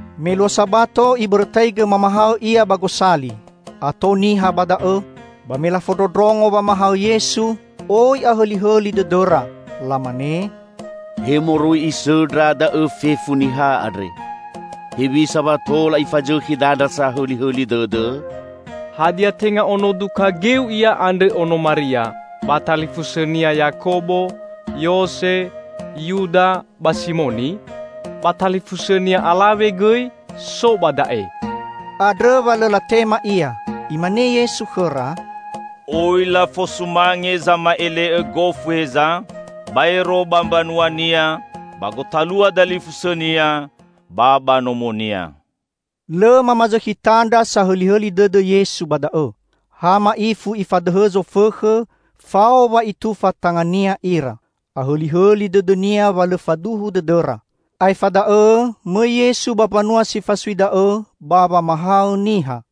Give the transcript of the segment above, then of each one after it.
Me luo Sabato Ibõrõtaigõ mamahaõ Ia ba gosali. Ato niha ba da'õ. Ba me lafondrondrongo wamahaõ Yesu, oi ahõlihõli dõdõra. Lamane, "He moroi Isõndra da'õ fefu niha andre? Hewisa wa tola Ifazõkhi dandra sahõlihõli dõdõ? Hadia, tenga ono duka geu Ia andrõ, ono Maria, ba talifusõ-Nia Yakobo, Yose, Yuda ba Simoni? Ba talifusõ-Nia alawe gõi so ba da'e." Andrõ wa lõ latema Ia. Imane Yesu khõra, "Oi lafosumange zama'ele'õ gofu heza, baero ba mbanuania, ba gotalua dalifusõnia ba ba nomonia." Lõ mamazõkhi tandra sahõlihõli dõdõ Yesu ba da'õ. Ha ma'ifu Ifadõhõ zofõkhõ fao wa Itufa tanga-Nia ira. Ahõlihõli dõdõ-Nia wa lõ faduhu dõdõra. Aefa da'õ mõi Yesu ba mbanua si fasui da'õ ba wamahaõ niha.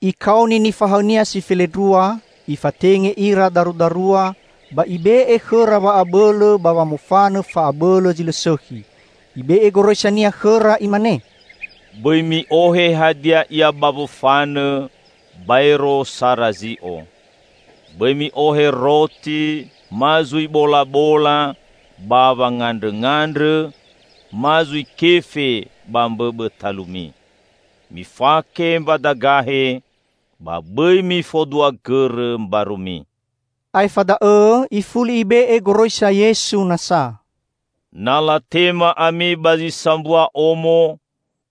Ikaoni nifahaõ-Nia si felendrua, Ifatenge ira darudarua ba Ibe'e khõra wa'abõlõ ba wamofanõ fa'abõlõ zi lõ sõkhi. Ibe'e goroisa-Nia khõra Imane, "Bõi mi'ohe hadia ia ba wofanõ, baero sara zi'o. Bõi mi'ohe roti ma zui bolabola ba wangandrõngandrõ, ma zui kefe ba mbõbõ talumi. Mifake mbadagahe, ba bõi mifodua gõrõ mbarumi." Aefa da'õ Ifuli Ibe'e goroisa Yesu nasa, "Na latema ami ba zi sambua omo,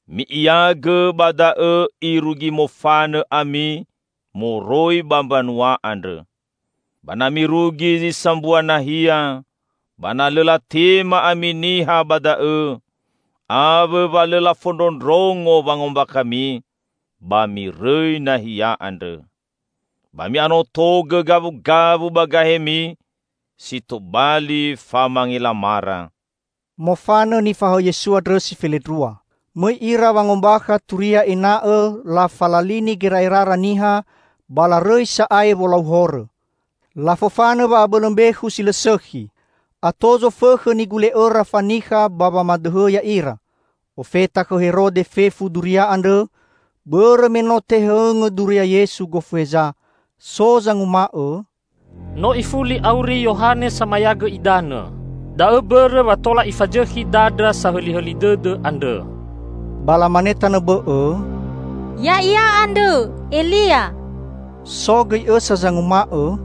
mi'iagõ ba da'õ irugi mofanõ ami moroi ba mbanua andrõ. Ba na mirugi zi sambua nahia, ba na lõ latema ami niha ba da'õ awõ wa lõ lafondrondrongo wangombakhami, ba mirõi nahia andrõ. Ba mi'anotogõ gawugawu ba gahemi si tobali famangelamara." Mofanõ nifahaõ Yesu andrõ si felendrua. Mõi ira wangombakha turia ena'õ lafalalini gera'erara niha ba larõi sa'ae wolau horõ. Lafofanõ wa'abõlõ mbekhu si lõ sõkhi. Ato zofõkhõ nigule'õra fanikha ba wamadõhõ ya'ira. Ofeta khõ Herode fefu duria andrõ, bõrõ me no tehõngõ duria Yesu gofu heza. So zanguma'õ, "No ifuli auri Yohane Samayagõ Idanõ! Da'õ mbõrõ wa tola ifazõkhi dandra sahõlihõli dõdõ andrõ." Ba lamane tanõ bõ'õ, "Ya'ia andrõ Elia." So gõi õsa zanguma'õ,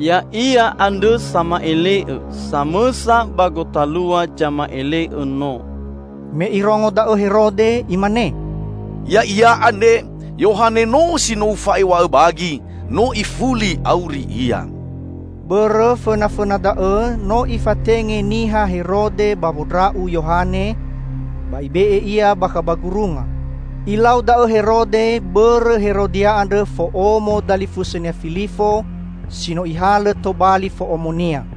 "Ya'ia andrõ sama'ele'õ, samõsa ba gotalua zama'ele'õ no." Me irongo da'õ Herode, imane, "Ya'ia andre Yohane no si no ufa'ew̃a'õ bagi. No ifuli auri ia!" Bõrõ fõnafõna da'õ no'ifatenge niha Herode ba wondra'u Yohane, ba ibe'e ia bakha ba gurunga. Ilau da'õ Herode bõrõ Herodia andrõ, fo'omo dalifusõnia Filifo si no ihalõ tobali fo'omonia.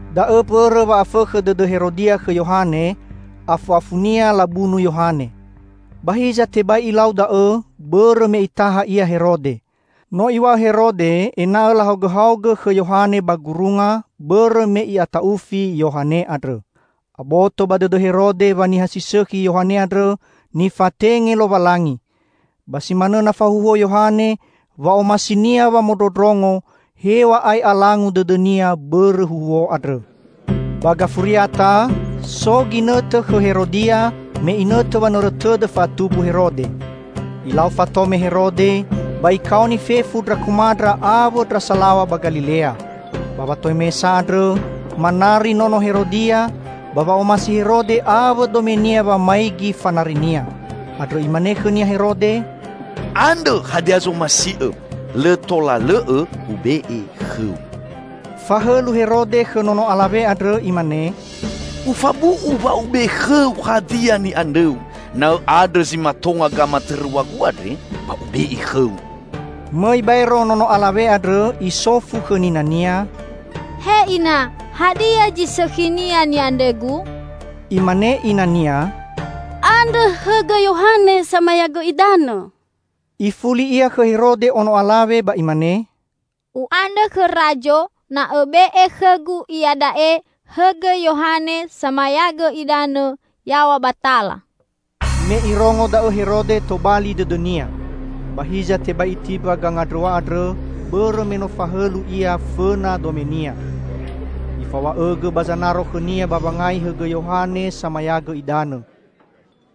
Da'õ mbõrõ wa afõkhõ dõdõ Herodia khõ Yohane, afu'afunia labunu Yohane. Ba hiza tebai ilau da'õ bõrõ me itaha ia Herode. No iw̃a'õ Herode ena'õ lahaogõhaogõ khõ Yohane ba gurunga bõrõ me i'ata'ufi Yohane andrõ. Aboto ba dõdõ Herode wa niha si sõkhi Yohane andrõ nifatenge Lowalangi. Ba si manõ na fahuhuo Yohane, wa'omasinia wamondrondrongo hew̃a'ae alangu dõdõnia bõrõ huhuo andrõ. Ba gafuriata, so ginõtõ khõ Herodia me inõtõ wanõrõ tõdõ fa'atumbu Herode. Ilau fatome Herode ba ikaoni fefu ndra komandra, awõ ndra salaw̃a ba Galilea. Ba watomesa andrõ manari nono Herodia, ba wa'omasi Herode awõ domenia wamaigi fanarinia. Andrõ imane khõnia Herode, "Andrõ hadia zomasi'õ. Lõ tola lõ'õ ube'e khõu!" Fahõlu Herode khõ nono alawe andrõ imane, "Ufabu'u wa ube'e khõu hadia ni'andrõu. Na õ'andrõ zi matonga gamatõrõw̃agu andre ba ube'e khõu!" Mõi baero nono alawe andrõ isofu khõ ninania, "He ina, hadia zi sõkhinia ni'andrõgu?" Imane inania, "Andrõ hõgõ Yohane Samayagõ Idanõ." Ifuli ia khõ Herode ono alawe ba imane, "U'andrõ khõ Razo na õbe'e khõgu iada'e hõgõ Yohane Samayagõ Idanõ yaw̃a ba tala!" Me irongo da'õ Herode tobali dõdõnia. Ba hiza tebai itimba gangandrõw̃a andrõ bõrõ me no fahõlu ia fõna domenia. Ifaw̃a'õgõ ba zanaro khõnia ba wangai hõgõ Yohane Samayagõ Idanõ.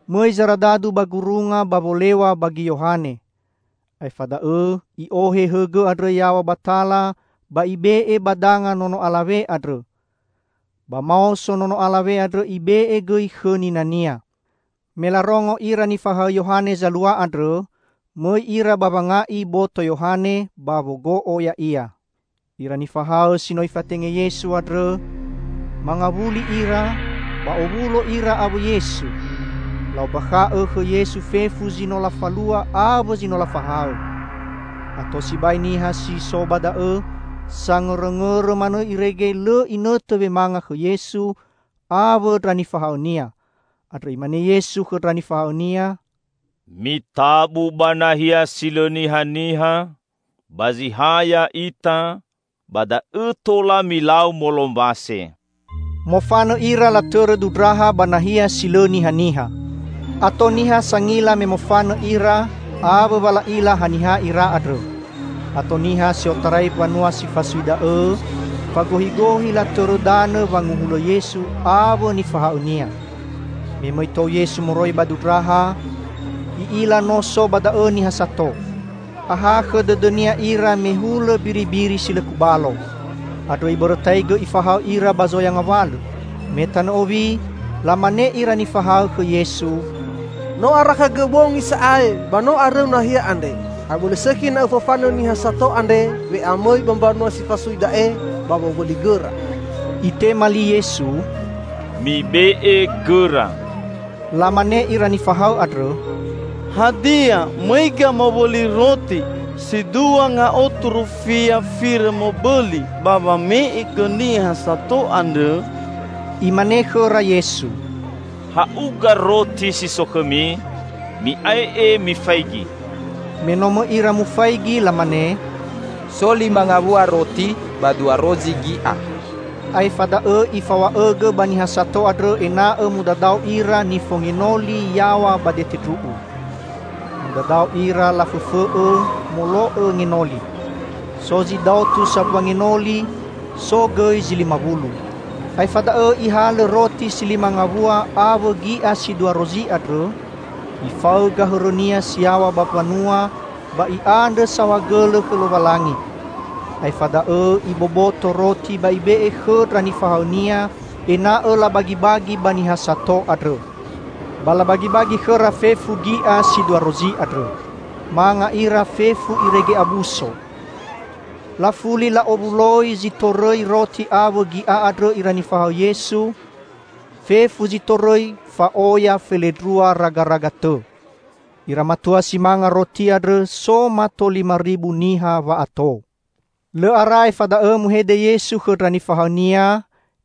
Mõi zaradadu ba gurunga ba wolew̃a bagi Yohane. Aefa da'õ i'ohe hõgõ andrõ yaw̃a ba tala ba ibe'e ba danga nono alawe andrõ. Ba maoso nono alawe andrõ ibe'e gõi khõ ninania. Me larongo ira nifahaõ Yohane zalua andrõ, mõi ira ba wanga'i boto Yohane, ba wogo'o ya'ia. Ira nifahaõ si no Ifatenge Yesu andrõ, mangawuli ira, ba owulo ira awõ Yesu. La'ombakha'õ khõ Yesu fefu zi no lafalua awõ zi no lafahaõ. Ato sibai niha si so ba da'õ sangõrõngõrõ manõ irege lõ inõtõ wemanga khõ Yesu awõ ndra nifahaõ-Nia. Andrõ Imane Yesu khõ ndra nifahaõ-Nia, "Mitabu ba nahia si lõ nihaniha, ba zi ha ya'ita ba da'õ tola milau molombase." Mofanõ ira latõrõ dundraha ba nahia si lõ nihaniha. Ato niha sangila me mofanõ ira awõ wa la'ila haniha ira andrõ. Ato niha si otarai mbanua si fasui da'õ fagohigohi latõrõ danõ wanguhulõ Yesu awõ nifahaõ-Nia. Me mõi tou Yesu moroi ba dundraha, I'ila no so ba da'õ niha sato. Ahakhõ dõdõ-Nia ira me hulõ mbiribiri si lõ kubalo. Andrõ Ibõrõtaigõ Ifahaõ ira ba zoya ngawalõ. Me tanõ owi, lamane ira nifahaõ khõ Yesu, "No arakhagõ bongi sa'ae ba no arõu nahia andre. Abõlõ sõkhi na Õfofanõ niha sato andre we'amõi ba mbanua si fasui da'e ba wowõli gõra." Itema li Yesu, "Mibe'e gõra!" Lamane ira nifahaõ andrõ, "Hadia, mõiga mowõli roti si dua ngaotu rufia firõ mobõli ba wame'e gõ niha sato andre?" Imane khõra Yesu, "Ha'uga roti si so khõmi. Mi'ae'e mifaigi!" Me no mõi ira mufaigi lamane, "So lima ngawua roti ba dua rozi gi'a." Aefa da'õ Ifaw̃a'õgõ ba niha sato andrõ ena'õ mudadao ira nifongenoli yaw̃a ba dete ndru'u. Mudadao ira lafõfõ'õ, molo'õ ngenoli. So zi daotu sambua ngenoli, so gõi zi lima wulu. Aefa da'õ Ihalõ roti si lima ngawua awõ gi'a si dua rozi andrõ, Ifaõga hõrõ-Nia si yaw̃a ba mbanua ba I'andrõ saohagõlõ khõ Lowalangi. Aefa da'õ, Iboboto roti ba Ibe'e khõ ndra nifahaõ-Nia ena'õ labagibagi ba niha sato andrõ. Ba labagibagi khõra fefu gi'a si dua rozi andrõ. Manga ira fefu irege abuso. Lafuli la'owuloi zi tõrõi roti awõ gi'a andrõ ira nifahaõ Yesu -- fefu zi torõi fa'oya felendrua ragaraga tõ. Ira matua si manga roti andrõ so mato lima ribu niha wa'ato. Lõ ara aefa da'õ muhede Yesu khõ ndra nifahaõ-Nia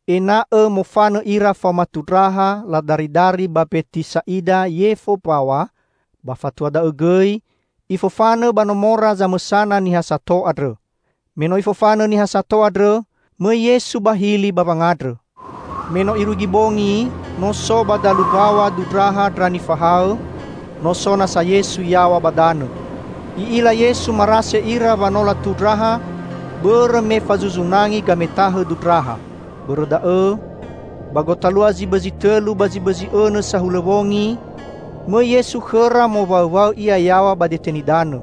ena'õ mofanõ ira faoma tundraha ladaridari ba Mbetisa'ida yefo mbaw̃a, ba fatua da'õ gõi Ifofanõ ba nomora zamõsana niha sato andrõ. Me no Ifofanõ niha sato andrõ, mõi Yesu ba hili ba wangandrõ. Me no irugi bongi, no so ba dalu mbaw̃a dundraha ndra nifahaõ, no so nasa Yesu yaw̃a ba danõ. I'ila Yesu marase ira wanola tundraha bõrõ me fazuzu nangi gametahõ dundraha. Bõrõ da'õ, ba gotalua zi bõzi tõlu ba bõzi õnõ sahulõ wongi, mõi Yesu khõra mowaõwaõ Ia yaw̃a ba dete nidanõ.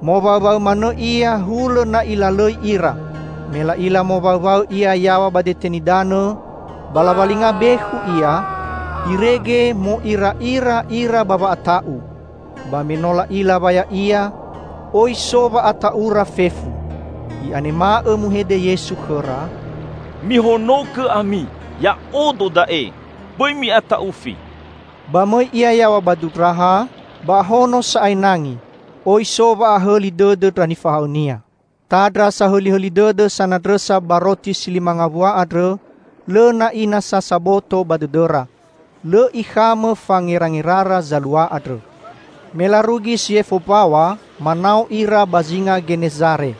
Mowaõwaõ manõ Ia hulõ na Ilalõi ira. Me la'ila mowaõwaõ Ia yaw̃a ba dete nidanõ, ba lawalinga bekhu Ia, irege mo'ira'ira ira ba wa'ata'u. Ba me no la'ila wa Ya'ia, oi so wa'ata'ura fefu. I'anema'õ muhede Yesu khõra, "Mihonogõ ami! Ya'odo da'e. Bõi mi'ata'ufi!" Ba mõi Ia yaw̃a ba dundraha, ba ahono sa'ae nangi. Oi so wa'ahõli dõdõ ndra nifahaõ-Nia. Tandra sahõlihõli dõdõ sanandrõsa ba roti si lima ngawua andrõ lõ na'i nasa saboto ba dõdõra. Lõ ikhamõ fangerangerara zalua andrõ. Me larugi si yefo mbaw̃a, manao ira ba zinga Genezare.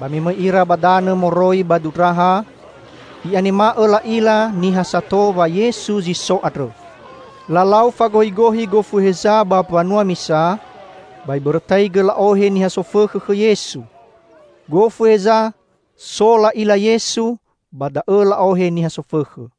Ba me mõi ira ba danõ moroi ba dundraha, i'anemai'õ la'ila niha sato wa Yesu zi so andrõ. Lalau fagohigohi gofu heza ba mbanua misa, ba ibõrõtaigõ la'ohe niha sofõkhõ khõ Yesu. Gofu heza so la'ila Yesu, ba da'õ la'ohe niha sofõkhõ.